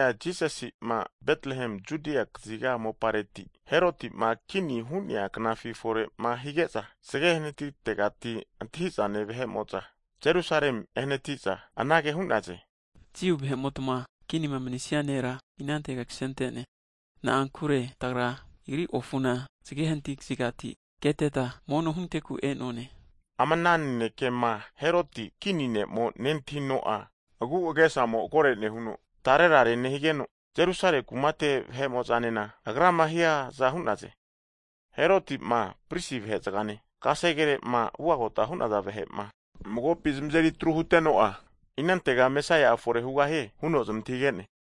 Jisasi'ma Betrehem Judia kaziga mopare, Heroti'ma kini hu'nea knafi fore'ma hige'za, zge hanatitegati antahi'zane vahe'mo'za Jerusalem ehanati'za, anage hu'naze, Jiu vahe'motma Kinima manisia nera inantega ksente'ne? Na'ankure tagra Agri ofuna zge hanati kazigati keteta, mono hunteku e'none. Ama ana nanekema Heroti kini ne'mo nentahino'a, agu'agesamo kore'nehuno tarerare nehigeno, Jerusale kumate vahe'mo'zanena agrama hiaza hu'naze. Heroti'ma pris vahe'zgane, kasegere'ma ugagota hu'naza vahe'ma magopi zamazeri atru huteno'a, inantega Mesaia'a fore hugahie? huno zamantahige'ne.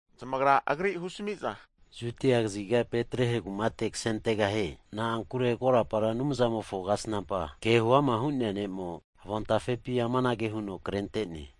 Zamagra, agri husmi'za, Judia kaziga Betrehe kumate ksentegahie, na'ankure korapa Anumzamofo kasnampa (profet) ke huama hu'nea ne'mo avon tafepi amanage huno krente'ne,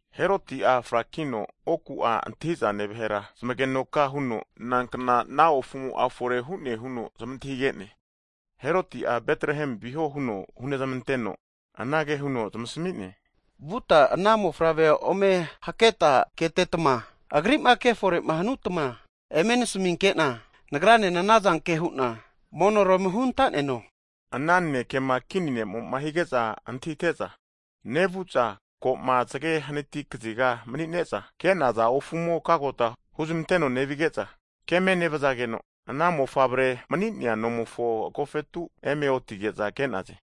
Heroti'a frakino oku'a antahi'zane vahera zamagenoka huno nankna ana ofumo'a fore hu'ne huno zamantahige'ne. Heroti'a Betrehem viho huno hunezmanteno, anage huno zamasmi'ne, Vutma ana Mofavrea ome haketa ketetma, Agri'ma kefore'ma hanutma eme nasminke'na, nagranena anazanke hu'na monora ome hunta'neno. Ana nanekema kini ne'mo hige'za antahite'za, nevu'za ko'ma zge hanati kaziga mani'neza ke'naza ofumo kagota huzmanteno nevige'za keme nevzageno ana Mofavre mani'nea nomofo agofetu eme otige'za ke'naze.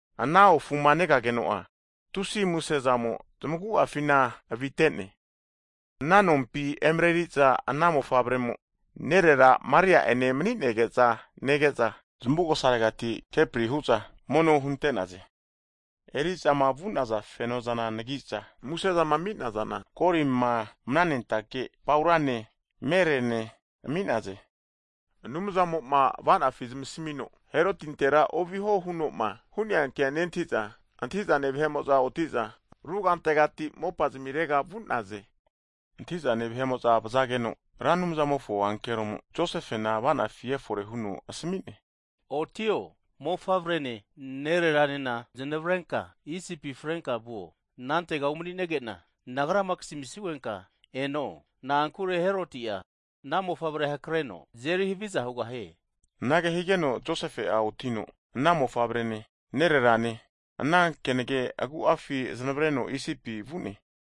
Ana ofuma negageno'a tusi'a muse zamo zamagu'afina avite'ne. Ana nompi emareri'za ana Mofavre'mo, nerera Maria'ene mani'nege'za nege'za, zamugosa regati kepri hu'za mono hunte'naze. Eri'zama vu'naza feno'zana anagi'za, musezama ami'nazana, golima, mananentake paurane (frankincense), mere'ne (myrrh) ami'naze. Anumzamo'ma ava'nafi zamasmino Herotintera oviho hunoma hu'nea kea nentahiza, antahi'zane vahe'mo'za oti'za rugantegati mopa zamirega vu'naze. Antahi'zane vahe'ma vzageno, Ra Anumzamofo ankeromo Josefena ava'nafi efore huno asmi'ne, Otio! Mofavrene, nerera'nena znavrenka Isipi frenka vuo, anantega umani'nege'na Nagrama kasmisugenka eno, na'ankure Heroti'a ana Mofavre hakreno azeri haviza hugahie huno asmi'ne. Anage higeno Josefe'a otino ana Mofavrene, nererane ana kenage agu'afi zanavreno Isipi vu'ne.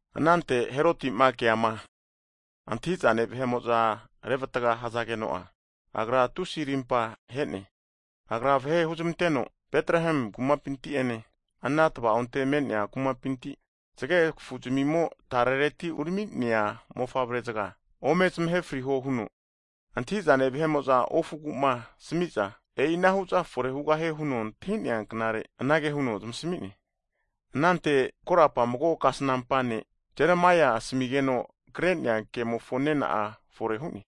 Anante Heroti'ma keama, antahi'zane vahe'mo'za revatga hzageno'a, agra tusi'a rimpa he'ne. Agra vahe huzmanteno, Betrehemi kumapinti ene, ana tva'onte me'nea kumapinti, zgegfu'zmimo tare zgekafureti urami'nea mofavre'zga ome zamahe friho huno antahi'zane vahe'mo'za ofugu'ma asmi'za, e'inahu'zana fore hugahie hazageno antahi'nea knagu anage huno zamasmi'ne. Anante korapa mago kasnampa ne' Jeremaia Anumzamo asmigeno kre'nea kemofo nena'a fore hu'ne,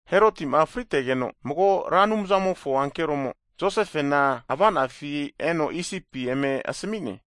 Heroti'ma fritegeno, mago Ra Anumzamofo ankeromo Josefena avanafi e'no Isipi eme asmi'ne,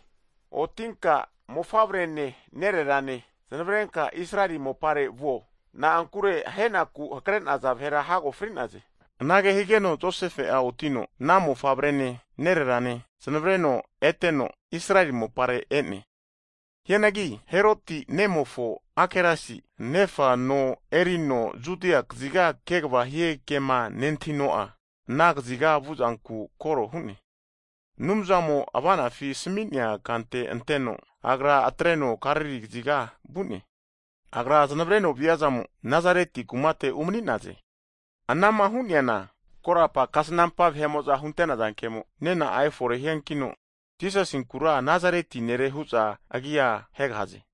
otinka, Mofavrene nererane znavarenka Israeli mopare vuo, na'ankure ahe'naku hakre'naza vahera hago fri'naze. Anage higeno Josefe'a otino ana Mofavrene, nererane zanavreno eteno Israeli mopare e'ne. Hianagi, Heroti nemofo Akelasi, nefa no erino Judia kaziga kegva hie kema nentahino'a, ana kaziga vuzanku koro hu'ne. Anumzamo ava'nafima asmi'nea kante anteno, agra (Josefe) atreno Galili kaziga vu'ne. Agra zanavreno viazamo, Nasareti kumate umani'naze. Anama hu'neana korapa kasnampa vahe'mo'za hunte'naza kemo nena'a efore hiankino Jisasinkura Nazareti Nere hu'za agia hegahaze.